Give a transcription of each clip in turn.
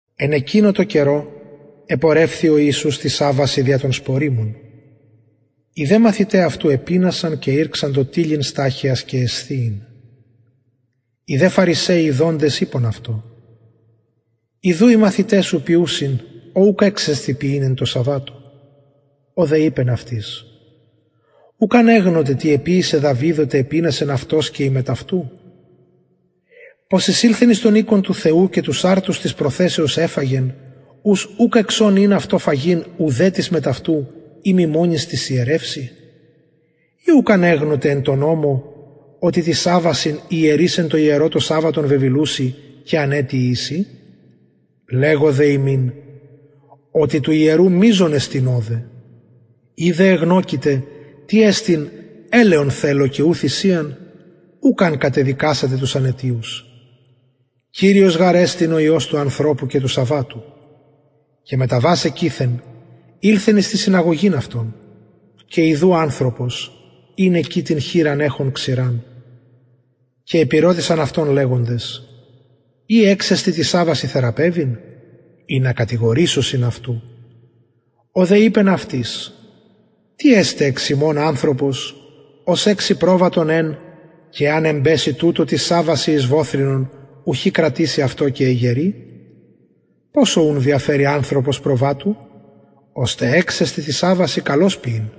εν εκεινω τω καιρω επορευθη ο ιησους τοις σαββασιν δια των σποριμων οι δε μαθηται αυτου επεινασαν και ηρξαντο τιλλειν σταχυας και εσθιειν οι δε φαρισαιοι ιδοντες ειπον αυτω ιδου οι μαθηται σου ποιουσιν ο ουκ εξεστιν ποιειν εν σαββατω ο δε ειπεν αυτοις ουκ ανεγνωτε τι εποιησεν δαυιδ οτε επεινασεν αυτος και οι μετ αυτου πως εισηλθεν εις τον οικον του θεου και τους αρτους της προθεσεως εφαγεν ους ουκ εξον ην αυτω φαγειν ουδε τοις μετ αυτου ει μη τοις ιερευσιν μονοις η ουκ ανεγνωτε εν τω νομω οτι τοις σαββασιν οι ιερεις εν τω ιερω το σαββατον βεβηλουσιν και αναιτιοι εισιν λεγω δε υμιν οτι του ιερου μειζον εστιν ωδε ει δε εγνωκειτε τι εστιν ελεον θελω και ου θυσιαν ουκ αν κατεδικασατε τους αναιτιους κυριος γαρ εστιν του σαββατου ο υιος του ανθρωπου και μεταβας εκειθεν ηλθεν εις την συναγωγην αυτων και ιδου ανθρωπος ην την χειρα εχων ξηραν και επηρωτησαν αυτον λεγοντες ει εξεστιν τοις σαββασιν θεραπευειν ινα κατηγορησωσιν αυτου ο δε ειπεν αυτοις τις εσται εξ υμων ανθρωπος ος εξει προβατον εν και εαν εμπεση τουτο τοις σαββασιν εις βοθυνον ουχι κρατησει αυτο και εγερει ποσω ουν διαφερει ανθρωπος προβατου ωστε εξεστιν τοις σαββασιν καλως ποιειν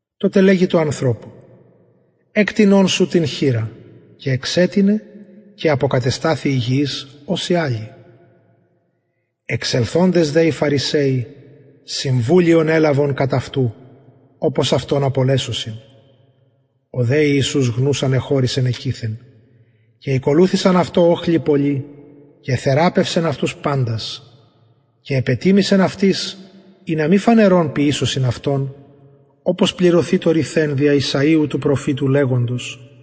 τοτε λεγει τω ανθρωπω εκτεινον την χειρα σου και εξετεινεν και αποκατεσταθη υγιης ως η αλλη οι δε φαρισαιοι συμβουλιον ελαβον κατ αυτου εξελθοντες οπως αυτον απολεσωσιν ο δε ιησους γνους ανεχωρησεν εκειθεν και ηκολουθησαν αυτω οχλοι πολλοι και εθεραπευσεν αυτους παντας και επετιμησεν αυτοις ινα μη φανερον αυτον ποιησωσιν οπως πληρωθη το ρηθεν δια ησαιου του προφητου λεγοντος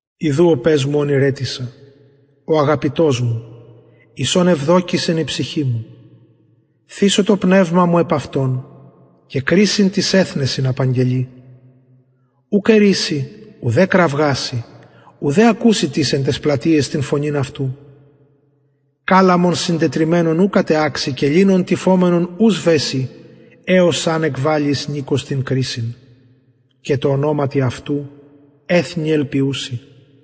ιδου ο παις μου ον ηρετισα ο αγαπητος μου εις ον ευδοκησεν η ψυχη μου θησω το πνευμα μου επ αυτον και κρισιν τοις εθνεσιν απαγγελει ουκ ερισει ουδε κραυγασει ουδε ακουσει τις εν ταις πλατειαις την φωνην αυτου καλαμον συντετριμμενον ου κατεαξει και λινον τυφομενον ου σβεσει εως αν εκβαλη εις νικος την κρισιν και τω ονοματι αυτου εθνη ελπιουσιν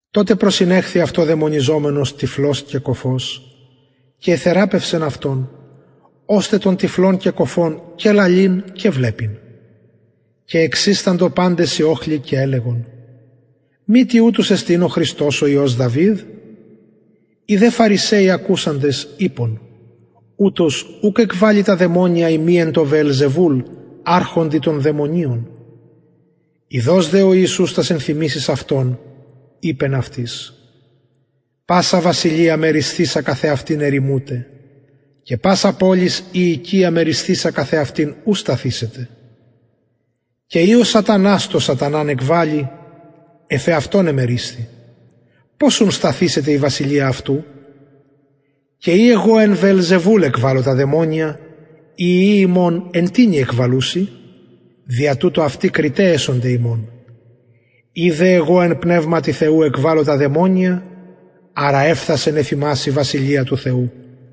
τοτε προσηνεχθη αυτω δαιμονιζομενος τυφλος και κωφος και εθεραπευσεν αυτον ωστε τον τυφλον και κωφον και λαλειν και βλεπειν και εξισταντο παντες οι οχλοι και ελεγον μητι ουτος εστιν ο υιος δαυιδ οι δε φαρισαιοι ακουσαντες ειπον ουτος ουκ εκβαλλει τα δαιμονια ει μη εν τω βεελζεβουλ αρχοντι των δαιμονιων ειδως δε ο ιησους τας ενθυμησεις αυτων ειπεν αυτοις πασα βασιλεια μερισθεισα καθ εαυτης ερημουται και πασα πολις η οικια μερισθεισα καθ εαυτης ου σταθησεται και ει ο σατανας τον σαταναν εκβαλλει εφ εαυτον εμερισθη πως ουν σταθησεται η βασιλεια αυτου και ει εγω εν βεελζεβουλ εκβαλλω τα δαιμονια οι υιοι υμων εν τινι εκβαλλουσιν δια τουτο αυτοι υμων εσονται κριται ει δε εν πνευματι θεου εγω εκβαλλω τα δαιμονια αρα εφθασεν εφ υμας η βασιλεια του θεου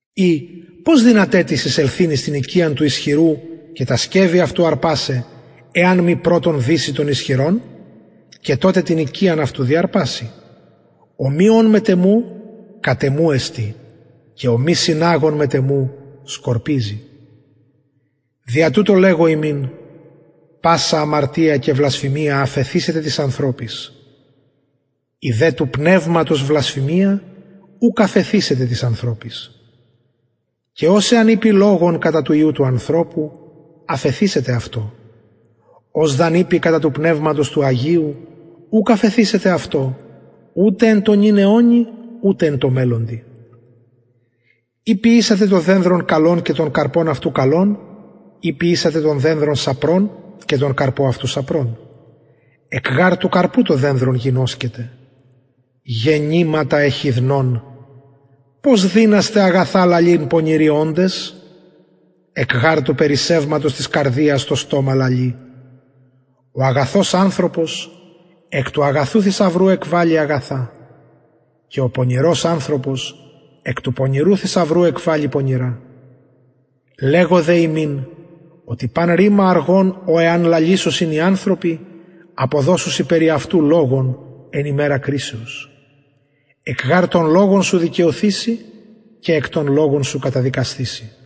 η πως δυναται τις εισελθειν εις την οικιαν του ισχυρου και τα σκευη αυτου διαρπασαι εαν μη πρωτον δηση τον ισχυρον και τοτε την οικιαν αυτου διαρπασει ο μη ων μετ εμου κατ εμου εστιν και ο μη συναγων μετ εμου σκορπιζει δια τουτο λεγω υμιν πασα αμαρτια και βλασφημια αφεθησεται τοις ανθρωποις η δε του πνευματος βλασφημια ουκ αφεθησεται τοις ανθρωποις και ος εαν ειπη λογον κατα του υιου του ανθρωπου αφεθησεται αυτω ος δ αν ειπη κατα του πνευματος του αγιου ουκ αφεθησεται αυτω ουτε εν τω νυν αιωνι ουτε εν τω μελλοντι η ποιησατε το δενδρον καλον και τον καρπον αυτου καλον η ποιησατε το δενδρον σαπρον και τον καρπον αυτου σαπρον εκ γαρ του καρπου το δενδρον γινωσκεται γεννηματα εχιδνων πως δυνασθε αγαθα λαλειν πονηροι οντες εκ γαρ του περισσευματος της καρδιας το στομα λαλει ο αγαθος ανθρωπος εκ του αγαθου θησαυρου εκβαλλει αγαθα και ο πονηρος ανθρωπος εκ του πονηρου θησαυρου εκβαλλει πονηρα λεγω δε υμιν οτι παν ρημα αργον ο εαν λαλησωσιν οι ανθρωποι αποδωσουσιν περι αυτου λογον εν ημερα κρισεως εκ γαρ των λογων σου δικαιωθηση και εκ των λογων σου καταδικασθηση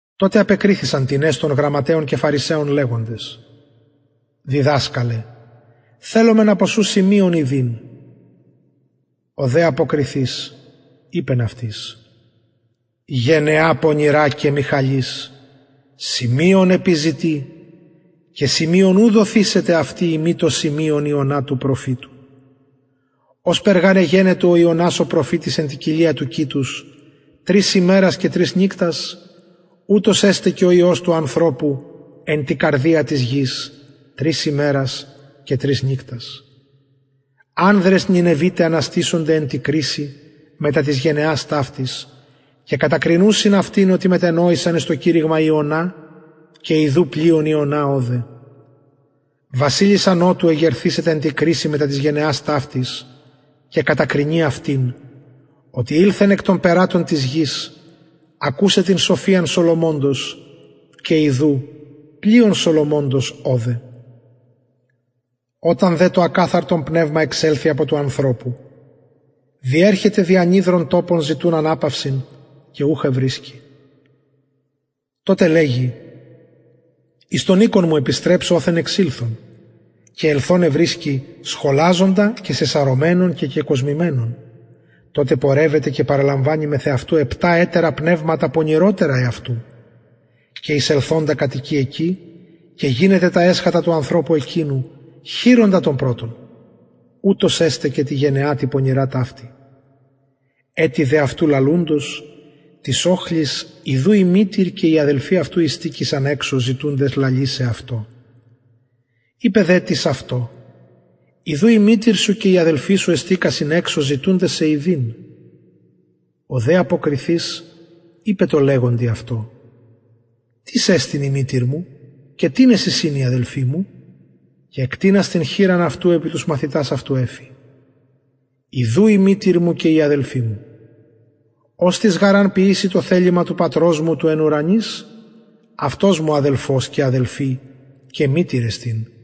τοτε απεκριθησαν τινες των γραμματεων και φαρισαιων λεγοντες διδασκαλε θελομεν απο σου σημειον ιδειν ο δε αποκριθεις ειπεν αυτοις γενεα πονηρα και μοιχαλις σημειον επιζητει και σημειον ου δοθησεται αυτη ει μη το σημειον ιωνα του προφητου ωσπερ γαρ ην ιωνας εν τη κοιλια του κητους τρεις ημερας και τρεις νυκτας ουτως εσται ο υιος του ανθρωπου εν τη καρδια της γης τρεις ημερας και τρεις νυκτας ανδρες νινευιται αναστησονται εν τη κρισει μετα της γενεας ταυτης και κατακρινουσιν αυτην οτι μετενοησαν εις το κηρυγμα ιωνα και ιδου πλειον ιωνα ωδε βασιλισσα νοτου εγερθησεται εν τη κρισει μετα της γενεας ταυτης και κατακρινει αυτην οτι ηλθεν εκ των περατων της γης ακουσαι την σοφιαν σολομωνος και ιδου πλειον σολομωνος ωδε οταν δε το ακαθαρτον πνευμα εξελθη απο του ανθρωπου διερχεται δι ανυδρων τοπων ζητουν αναπαυσιν και ουχ ευρισκει τοτε λεγει επιστρεψω εις τον οικον μου οθεν εξηλθον και ελθον ευρισκει σχολαζοντα σεσαρωμενον και κεκοσμημενον τοτε πορευεται και παραλαμβανει μεθ εαυτου επτα ετερα πνευματα πονηροτερα εαυτου και εισελθοντα κατοικει εκει και γινεται τα εσχατα του ανθρωπου εκεινου χειρονα των πρωτων ουτως εσται και τη γενεα ταυτη τη πονηρα ετι δε αυτου λαλουντος τοις οχλοις ιδου η μητηρ και οι αδελφοι αυτου ειστηκεισαν εξω ζητουντες αυτω λαλησαι ειπεν δε τις αυτω ιδου η μητηρ σου και οι αδελφοι σου εξω εστηκασιν ζητουντες σοι λαλησαι ο δε αποκριθεις ειπεν τω ειποντι αυτω τις εστιν η μητηρ μου και τινες εισιν οι αδελφοι μου και εκτεινας την χειρα αυτου επι τους μαθητας αυτου ειπεν ιδου η μητηρ μου και οι αδελφοι μου οστις γαρ αν ποιηση το θελημα του πατρος μου του εν ουρανοις αυτος μου αδελφος και αδελφη και μητηρ εστιν